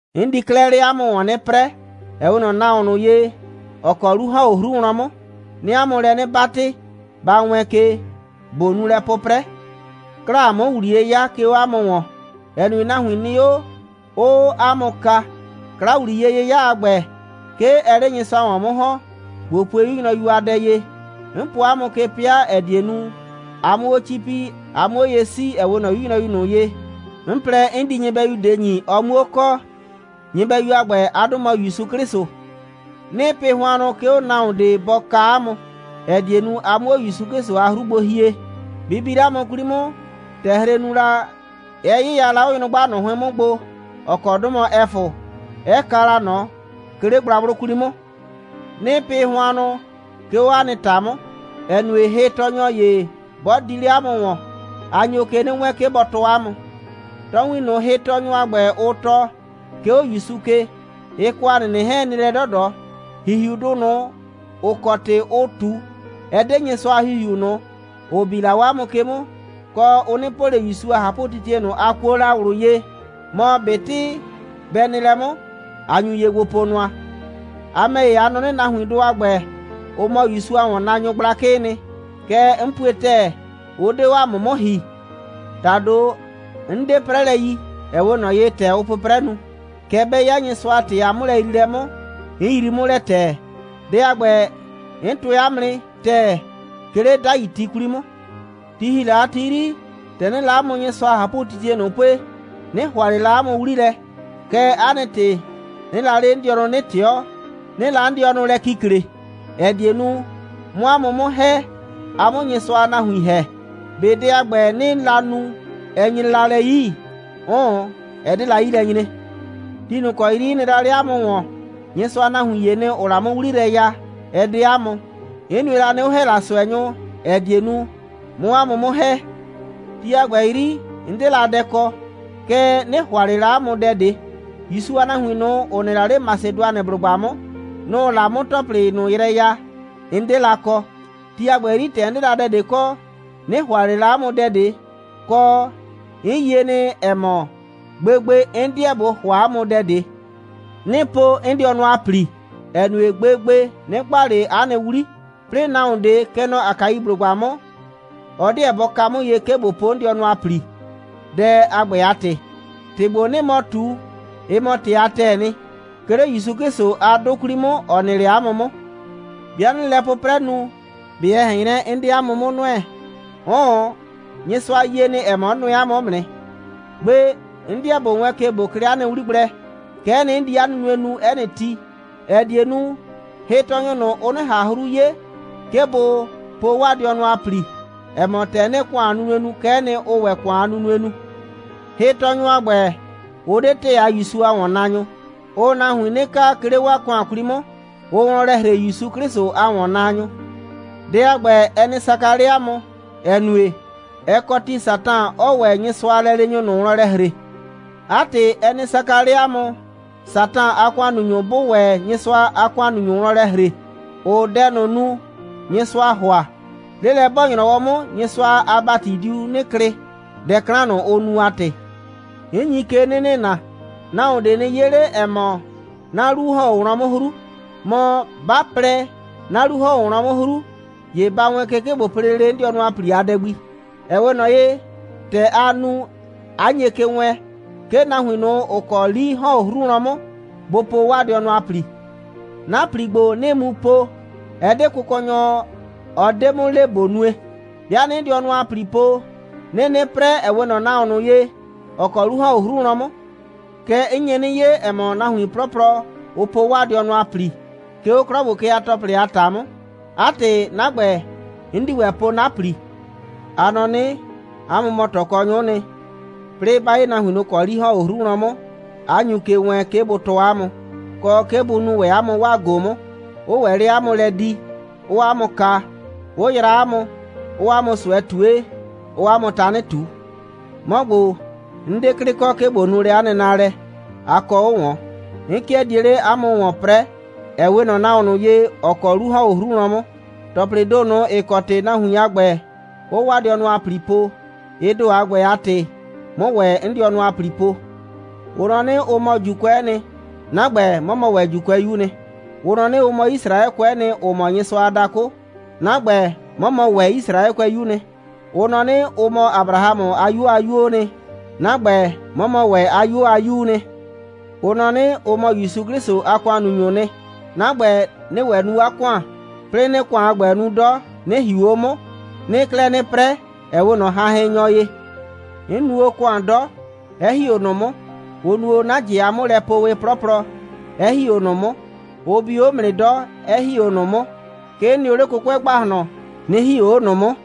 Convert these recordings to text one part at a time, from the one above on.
'N di 'klɛɛ 'le 'a mʋ ‑wɔn 'nɩ 'prɛɛ, ‑ɛ 'we ꞊nɔ nahuon ꞊nʋ ye, ‑ɔ kɔ 'lu ‑hɔn 'o 'hru wlɔn 'mʋ. 'Nɩɩ 'a mʋ lɛ 'nɩ 'batɩ, ba wɛɛn ke, ꞊bo nu lɛ 'pʋprɛ. 'Klaa 'mʋ ‑wliye 'ya, 'ke 'o 'a mʋ ‑wɔn, ‑ɛ nue, nahuin nɩ 'o, 'ʋʋ 'a mʋ kaa. 'Kla‑wliye'yɩya a ‑gbɛ, 'ke ɛɛ 'le Nyɩsʋa ‑wɔn 'mʋ ‑hɔn. ꞊Bo pue 'yu nyrɔyu a dɛ ye: 'N po 'a mʋ ke 'pɩa, ‑ɛ die nu, a 'mʋ 'o 'cipi, a 'mʋ 'o ye 'sii, ‑ɛ 'we ꞊nɔ 'yu nyrɔyu ꞊nʋ ye, 'n plɛ, 'n di nyɩbɛyu ꞊de ‑nyi, ɔ 'muo kɔ. Nyɩbɛyu a ‑gbɛ, 'a 'dʋ mɔ ‑Yusu 'Klɩsʋ. 'Nɩɩ pɩ hʋannʋ, 'ke nahuon ꞊de bɔ kaa 'a mʋ, ‑ɛ die nu, a 'mʋ 'o ‑Yusu 'Klɩsʋ a 'hru gbo hie. Bɩ bi 'le 'a mʋ 'kwli 'mʋ, ‑tɛ hre nu la, 'ɛ 'yɩya la 'o nyrʋgba ꞊nʋ 'hʋɩn 'mʋ gbo, ‑ɔ kɔ 'dʋ mɔ Ɛfʋ, 'ɛ kaa la ꞊nɔ, 'ke 'le gblagblʋ 'kwli 'mʋ. 'Nɩɩ pɩ hʋannʋ, 'ke 'o 'a nɩ ‑ta 'mʋ, ‑ɛ nue, hɩtɔɔnyɔ ‑ye 'bɔ di 'le 'a mʋ ‑wɔn, a nyo ke 'nɩ wɛɛn, 'ke bɔ tɔɔ 'a mʋ. Tɔɔwin ꞊nʋ, hɩtɔɔnyʋ a ‑gbɛ, ʋ tɔɔ, 'ke 'o ‑Yusu ke, ɩ kɔ ‑a nɩnɩ 'hɛɛn, ɩ nɩ lɛ 'dɔdɔ. ‑Hihiudʋ ꞊nʋ, ‑ʋ kɔ ‑tɩ ʋʋ ꞊tu, ɛ 'de Nyɩsʋa a ‑Hihiu ꞊nʋ, ‑ʋ bi la 'o 'a mʋ ke 'mʋ, kɔ, ʋ 'nɩ po ꞊le ‑Yusu a ꞊hapʋtitie ꞊nʋ, a kuo la ꞊wlʋ ye. Mɔ ꞊betɩ bɛ nɩ lɛ 'mʋ, a nyu ye gbo po nʋa. A ‑mɛ ‑ye, a nɔ 'nɩ, nahuindʋ a ‑gbɛ, ʋ mɔ ‑Yusu a ‑wɔnnaanyʋ gblakɩɩ nɩ. Kɛɛ, 'n pue ‑tɛɛ, ʋ 'de 'o 'mʋ 'mʋ ‑hi. ‑Tado, 'n 'de 'prɛlɛ yi, ‑ɛ 'we ꞊nɔ ye, ‑tɛ ʋʋ 'pʋprɛ nu. Kɛɛ, 'bɛ 'ya Nyɩsʋa a ‑tɩ a 'mʋlɛyriilɛ 'mʋ, 'n yrii 'mʋ lɛ ‑tɛɛ. Dɛ a ‑gbɛ, 'n tʋɛ 'a mʋ nɩ ‑tɛɛ, 'ke 'le 'dai ti 'kwli 'mʋ. Ti ‑hi la a ti 'yri, ‑tɛ 'nɩɩ la 'a mʋ Nyɩsʋa a ꞊hapʋtitie ꞊nʋ pue, 'nɩ ‑hʋa ꞊le la 'a mʋ 'wli lɛ. Kɛɛ, 'a nɩ ‑tɩ, 'nɩɩ la 'le 'n dɩɔnʋ 'nɩ ꞊tɩɔ, 'nɩɩ la 'n dɩɔnʋ lɛ kikle, ‑ɛ die nu, 'mʋ 'a mʋ 'mʋ ‑hɛ, a 'mʋ Nyɩsʋa a nahuin ‑hɛ. ꞊Be dɛ a ‑gbɛ, 'nɩɩ la nu, ɛ nyre la lɛ 'yi? 'Ʋʋn, ɛ 'de la 'yi lɛ nyre. Ti ꞊nʋ ‑kɔ 'yri 'n nɩ la 'le 'a mʋ ‑wɔn, Nyɩsʋa a nahuin ‑yee nɩ, ‑ʋʋ la 'mʋ 'wli yrɛ ya, ɛ 'de 'a mʋ. 'N nue la nɩ, 'ʋ ‑hɛ la ꞊sʋɛnyʋ, ‑ɛ die nu, 'mʋ 'a mʋ 'mʋ ‑hɛ. Ti a ‑gbɛ 'yri, 'n 'de la dɛ kɔ. Kɛɛ, 'nɩ ‑hʋa ꞊le la 'a mʋ dɛ ꞊de. ‑Yusu a nahuin ꞊nʋ, ‑ʋ nɩ 'le Masɩdʋanɩblʋgba 'mʋ, nʋ‑ʋ la 'mʋ ‑tɔplɩ ꞊nʋ yrɛ ya, 'n 'de la kɔ. Ti a ‑gbɛ 'yri, ‑tɛ 'n 'de la dɛ ꞊de kɔ, 'nɩ ‑hʋa ꞊le la 'a mʋ dɛ ꞊de, kɔ, 'n yie nɩ, ‑ɛ mɔ, gbegbe, 'n 'deɛ ꞊bo ‑hʋa 'a mʋ dɛ ꞊de. 'Nɩɩ po 'n dɩɔnʋ a ‑pli, ‑ɛ nue, gbegbe, 'nɩ gba ꞊le 'a nɩ 'wli. 'Plɩɩ nahuon ꞊de, kɛ nɔ Akaiblʋgba 'mʋ, ɔ 'deɛ bɔ ka 'mʋ ye, 'ke ꞊bo po 'n dɩɔnʋ a ‑pli, dɛ a ‑gbɛ a ‑tɩ. ‑Tɩ ‑gbo, 'nɩɩ mɔ ꞊tu, ɩ mɔ ‑tɩ a ‑tɛɛ nɩ, 'ke 'le ‑Yusu 'Klɩsʋ a 'dʋ 'kwli 'mʋ, ‑ɔ nɩ 'le 'mʋ 'mʋ. 'Bɩa 'nɩɩ lɛ 'pʋprɛ nu, ꞊be ɛ ꞊hɛn 'nyrɛ, 'n 'de 'a mʋ 'mʋ nʋɛ? 'Ʋʋn, Nyɩsʋa yie nɩ, ‑ɛ mɔ, 'n nʋɛ 'a mʋ 'mʋ nɩ. Gbe 'n 'dɩɛ ꞊bo wɛɛn ke, 'ke ꞊bo klɩ 'a nɩ 'wli gblɛ. Kɛ'ɛ nɩ, 'n di 'a nunue nu 'ɛ nɩ ti, ‑ɛ die nu, hɩtɔɔnyʋ ꞊nʋ, ʋ 'nɩ ꞊han 'hru 'ye, 'ke bʋ po 'waa dɩɔnʋ a ‑pli, ‑ɛ mɔ, ‑tɛ 'nɩɩ ‑kʋan a nunue nu, kɛ'ɛ nɩ, ʋʋ ‑wɛ ‑kʋan a nunue nu. Hɩtɔɔnyʋ a ‑gbɛ, ʋ 'de ‑tɛɛ a ‑Yusu a ‑wɔnnaanyʋ. Ʋʋ nahuin 'nɩ kaa, 'ke 'le 'waa ‑kʋan 'kwli 'mʋ. Ʋʋ wlɔn lɛ ‑hre ‑Yusu 'Klɩsʋ a ‑wɔnnaanyʋ. Dɛ a ‑gbɛ, ɛ nɩ saka 'le 'a mʋ, ‑ɛ nue, ɛ kɔ ti, Satan 'ɔɔ ‑wɛ Nyɩsʋa a lɛleenyʋ ꞊nʋ wlɔn lɛ ‑hre. 'A ‑tɩ, ɛ nɩ saka 'le 'a mʋ, Satan a ‑kʋannunyʋ 'bʋʋ ‑wɛ Nyɩsʋa a ‑kʋannunyʋ ꞊nʋ wlɔn lɛ ‑hre, ‑ʋʋ dɛ ꞊nʋ nu, Nyɩsʋaa ‑hʋa. 'Lelɛ'bɔɔ‑nyrɔwɔ 'mʋ, Nyɩsʋa a ‑bati diu 'nɩ klɩ, dɛ 'klan ꞊nʋ, ʋ nu a ‑tɩ. 'N nyi ke 'nɩ nɩna: Nahuon ꞊de nɩ 'ye 'le, ‑ɛ mɔ, 'na 'lu ‑hɔn 'o wlɔn 'mʋ 'hru. Mɔ, 'ba plɛ, 'na 'lu ‑hɔn 'o wlɔn 'mʋ 'hru, ‑ye ba wɛɛn ke, 'ke ꞊bo po lele 'n dɩɔnʋ a ‑pli a dɛ gbi, ‑ɛ 'we ꞊nɔ ye, ‑tɛ aa nu, 'a nye ke wɛɛn, 'ke nahuin ꞊nʋ, ‑ʋ kɔ 'li ‑hɔn 'o 'hru wlɔn 'mʋ, bʋ po 'waa dɩɔnʋ a ‑pli. 'Na ‑pli ‑gbo, 'nɩɩ mu po, ɛ 'de Kʋkɔnyɔ, ɔ 'de 'mʋ le, ꞊bo nue. 'Bɩa 'nɩɩ 'n dɩɔnʋ a ‑pli po, 'nɩɩ 'nɩ 'prɛ, ‑ɛ 'we ꞊nɔ nahuon ꞊nʋ ye, ‑ɔ kɔ 'lu ‑hɔn 'o 'hru wlɔn 'mʋ. Kɛɛ, 'n nye 'nɩ 'ye, ‑ɛ mɔ, nahuin 'plɔplɔ, ʋʋ po 'waa dɩɔnʋ a ‑pli, 'ke 'o 'klɔ ‑gbo ke a ‑tɔplɩ a ‑ta 'mʋ. 'A ‑tɩ, 'na ‑gbɛ, 'n di ‑wɛ po 'na ‑pli. A nɔ 'nɩ, 'a mʋ mɔ ꞊tɔkɔnyʋ'ʋ nɩ. 'Plɩɩ 'ba 'ye nahuin ꞊nʋ, ‑ʋ kɔ 'li ‑hɔn 'o 'hru wlɔn 'mʋ, 'a nyu ke wɛɛn, 'ke bʋ tɔɔ 'a mʋ, kɔ, 'ke bʋ nuu ‑wɛ 'a mʋ 'waa ꞊go 'mʋ, 'ʋʋ ‑wɛ 'le 'a mʋ lɛ di, 'ʋʋ 'a mʋ kaa, 'ʋ yraa 'a mʋ, 'ʋʋ 'a mʋ ꞊sʋɛ ꞊tue, 'ʋʋ 'a mʋ tanɩ ꞊tu. 'Mɔ ‑gbo, 'n 'de 'klɩ kɔ, 'ke ꞊bo di lɛ 'a nɩ naalɛ nu. A kɔ 'o ꞊wɔn. 'N 'kɩɛ die 'le 'a mʋ ‑wɔn 'prɛɛ, ‑ɛ 'we ꞊nɔ nahuon ꞊nʋ ye, ‑ɔ kɔ 'lu ‑hɔn 'o 'hru wlɔn 'mʋ. ‑Tɔplɩɩ ‑do ꞊nʋ, ‑ɩ kɔ ‑tɩ nahuin a ‑gbɛ, ʋʋ 'waa dɩɔnʋ a ‑pli po, ɩ ‑do a ‑gbɛ a ‑tɩ, 'mʋ ‑wɛ 'n dɩɔnʋ a ‑pli po. Ʋ nɔ 'nɩ, ʋ mɔ ‑Juukʋɛ'ɛ nɩ. 'Na ‑gbɛ, 'mɔ mɔ ‑wɛ ‑Juukʋɛyuu nɩ. Ʋ nɔ 'nɩ, ʋ mɔ Yisraɛkʋɛ'ɛ nɩ, ‑ʋ mɔ Nyɩsʋa a dakʋ. 'Na ‑gbɛ, 'mɔ mɔ ‑wɛ Yisraɛkʋɛyuu nɩ. Ʋ nɔ 'nɩ, ʋ mɔ Abrahamʋ a 'yuo a 'yuoo nɩ. 'Na ‑gbɛ, 'mɔ mɔ ‑wɛ 'a 'yuo a 'yuu nɩ. Ʋ nɔ 'nɩ, ʋ mɔ ‑Yusu 'Klɩsʋ a ‑kʋannunyʋʋ nɩ. 'Na ‑gbɛ, 'nɩɩ ‑wɛ nu 'a ‑kʋan, 'plɩɩ 'nɩɩ ‑kʋan a ‑gbɛ nu 'dɔ, 'nɩ ‑hiu 'o 'mʋ. 'Nɩɩ 'klɛɛ 'nɩ 'prɛ, ‑ɛ 'we ꞊nɔ hanhɩnnyɔ ye. 'N nu o ‑kʋan 'dɔ, 'ɛ ‑hi 'o ꞊nʋ 'mʋ. Ʋ nu o 'na ꞊jɩ a 'mʋlɛpoowɩ 'plɔplɔ, 'ɛ ‑hi 'o ꞊nʋ 'mʋ. Ʋ bi o 'mʋ nɩ 'dɔ, 'ɛ ‑hi 'o ꞊nʋ 'mʋ. 'Ke 'n nɩ o 'le 'kʋkʋɛ ‑gbahlɔn, 'nɩ ‑hi 'o ꞊nʋ 'mʋ.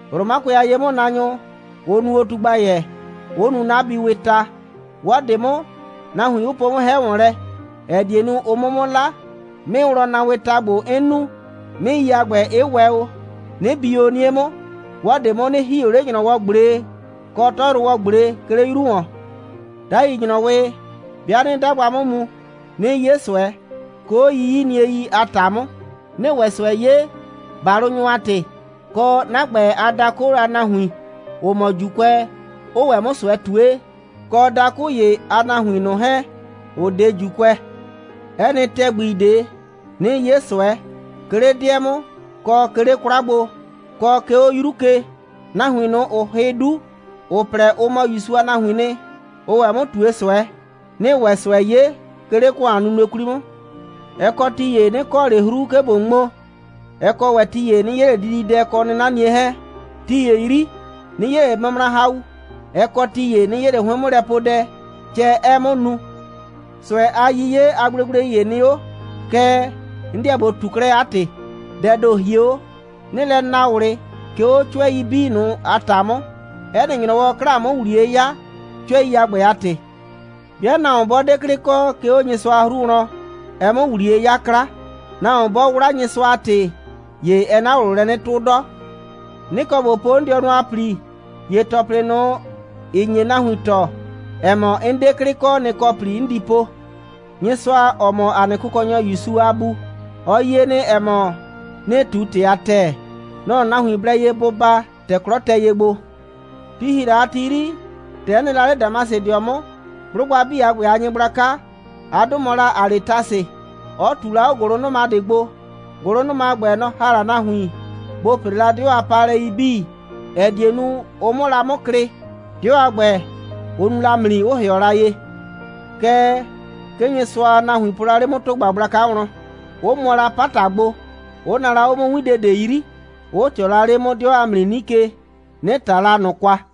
Romakʋɛ a ye'mʋnaanyʋ 'ʋ nu o tugbayɛ, 'ʋ nu 'na biiwɩɩ ta. 'Wɔ ꞊de 'mʋ, nahuin 'ʋ po o 'mʋ 'hɛ ‑wɔn lɛ, ‑ɛ die nu, ʋ 'mʋ 'mʋ 'la. 'Mɩɩwlɔnnaawɩɩ ta ‑gbo, 'n nu, 'mɩɩi a ‑gbɛ, 'ɩ wɛ o, 'nɩ bi o 'nie 'mʋ. 'Wɔ ꞊de 'mʋ, 'nɩ ‑hi o 'le ‑nyrɔwɔ꞊gble kɔ 'tɔyrʋwɔ꞊gble, 'ke 'le 'yru ‑wɔn. 'Dai ‑nyrɔwɩ, 'bɩa 'nɩɩ 'dagba 'mʋ mu, 'nɩɩ 'ye ꞊sʋɛ, 'ke 'o 'yiyiniei a ‑ta 'mʋ, 'nɩɩ ‑wɛ ꞊sʋɛ 'ye, ‑balʋnyʋ a ‑tɩ, kɔ, 'na ‑gbɛ a dakʋ a nahuin, ‑ʋ mɔ ‑Juukʋɛ, 'ʋʋ ‑wɛ 'mʋ ꞊sʋɛ ꞊tue, kɔ dakʋ ‑ye a nahuin ꞊nʋ 'hɛɛn, ‑ʋ 'de ‑Juukʋɛ. 'Ɛ nɩ ‑tɛgbi ꞊de, 'nɩɩ 'ye ꞊sʋɛ, 'ke 'le 'dɩɛ 'mʋ, kɔ 'ke 'le 'kwla gbo, kɔ 'ke 'o 'yru ke, nahuin ꞊nʋ, ‑ʋʋ hɩ 'du, ‑ʋ plɛ, ʋ mɔ ‑Yusu a nahuiin nɩ, 'ʋʋ ‑wɛ 'mʋ ꞊tue ꞊sʋɛ, 'nɩɩ ‑wɛ ꞊sʋɛ 'ye, 'ke 'le ‑kʋan a nunue 'kwli 'mʋ. Ɛ kɔ ti ‑ye, 'nɩ kɔ ꞊le 'hru, 'ke ꞊bo ŋmo. Ɛ kɔ ‑wɛ ti ‑ye, 'nɩ 'ye ꞊le dididɛ kɔ 'nɩnanie 'hɛɛn. Ti ‑ye 'yri, 'nɩ 'ye ꞊le mʋmrahau. Ɛ kɔ ti ‑ye, 'nɩ 'ye ꞊le 'hʋɩn'mʋlɛpuedɛ, cɛ 'ɛɛ 'mʋ nu. ꞊Sʋɛ a 'yiye a gblegblei ‑ye nɩ 'o, kɛɛ, 'n 'deɛ ꞊bo ꞊tu 'klɛɛ 'a ‑tɩ. Dɛɛ ‑do hie 'o. 'Nɩɩ lɛ naa ꞊wlɩ, 'ke 'o 'cʋɛi 'bii a ‑ta 'mʋ. 'Ɛ nɩ ‑nyrɔwɔ, 'klaa 'mʋ ‑wliye 'ya, 'cʋɛi a ‑gbɛ a ‑tɩ. 'Bɩa nahuon 'bɔ 'de 'klɩ kɔ, 'ke 'o Nyɩsʋa a 'hru wlɔn, ɛɛ 'mʋ ‑wliye 'yaa 'kla. Nahuon 'bɔ 'wla Nyɩsʋa a ‑tɩ, ‑ye ɛɛ 'na ꞊wlʋ lɛ 'nɩ 'tʋ 'dɔ. 'Nɩ kɔ ꞊bo po 'n dɩɔnʋ a ‑pli, ‑ye ‑tɔplɩ ꞊nʋ, ‑ɩ nye nahuin tɔɔ, ‑ɛ mɔ, 'n 'de 'klɩ kɔ, nɩ‑ kɔ ‑pli 'n di po. Nyɩsʋa, ‑ɔ mɔ ‑a nɩ Kʋkɔnyɔ ‑Yusu a Bu, ɔ yie nɩ, ‑ɛ mɔ, 'nɩɩ ꞊tu ‑tɩ a ‑tɛɛ. Nɔ‑ nahuin blɛ ye bʋ baa, ‑tɛ 'klɔ tɛ ye gbo. Ti ‑hi la a ti 'yri, ‑tɛ 'n nɩ la 'le Damasɩdɩɔ 'mʋ, 'blʋgba 'bii a ‑gbɛ a nyɩgblaka, 'a 'dʋ mɔ la Aletasɩ, 'ɔ ꞊tu la 'o ‑gʋlʋnʋma ꞊de gbo. ‑Gʋlʋnʋma a ‑gbɛ, nɔ‑ ‑ha la nahuin, bʋ ‑pre la 'dɩɔ a paalɛi 'bii, ‑ɛ die nu, ʋ 'mʋ la 'mʋ klɩ. 'Dɩɔ a ‑gbɛ, ʋ nu la ‑mli, 'ʋ ‑hɩɔ la ye. Kɛɛ, 'ke Nyɩsʋa a nahuin po la 'le 'mʋ ‑tʋgba gblaka wlɔn, 'ʋ mʋɔ la 'pata gbo, 'ʋ naa la 'o 'mʋ 'winde ꞊de 'yri, 'ʋ ꞊tɩɔ la 'le 'mʋ 'dɩɔ a ‑mli 'nike, 'nɩ ꞊ta la ꞊nʋ kwa.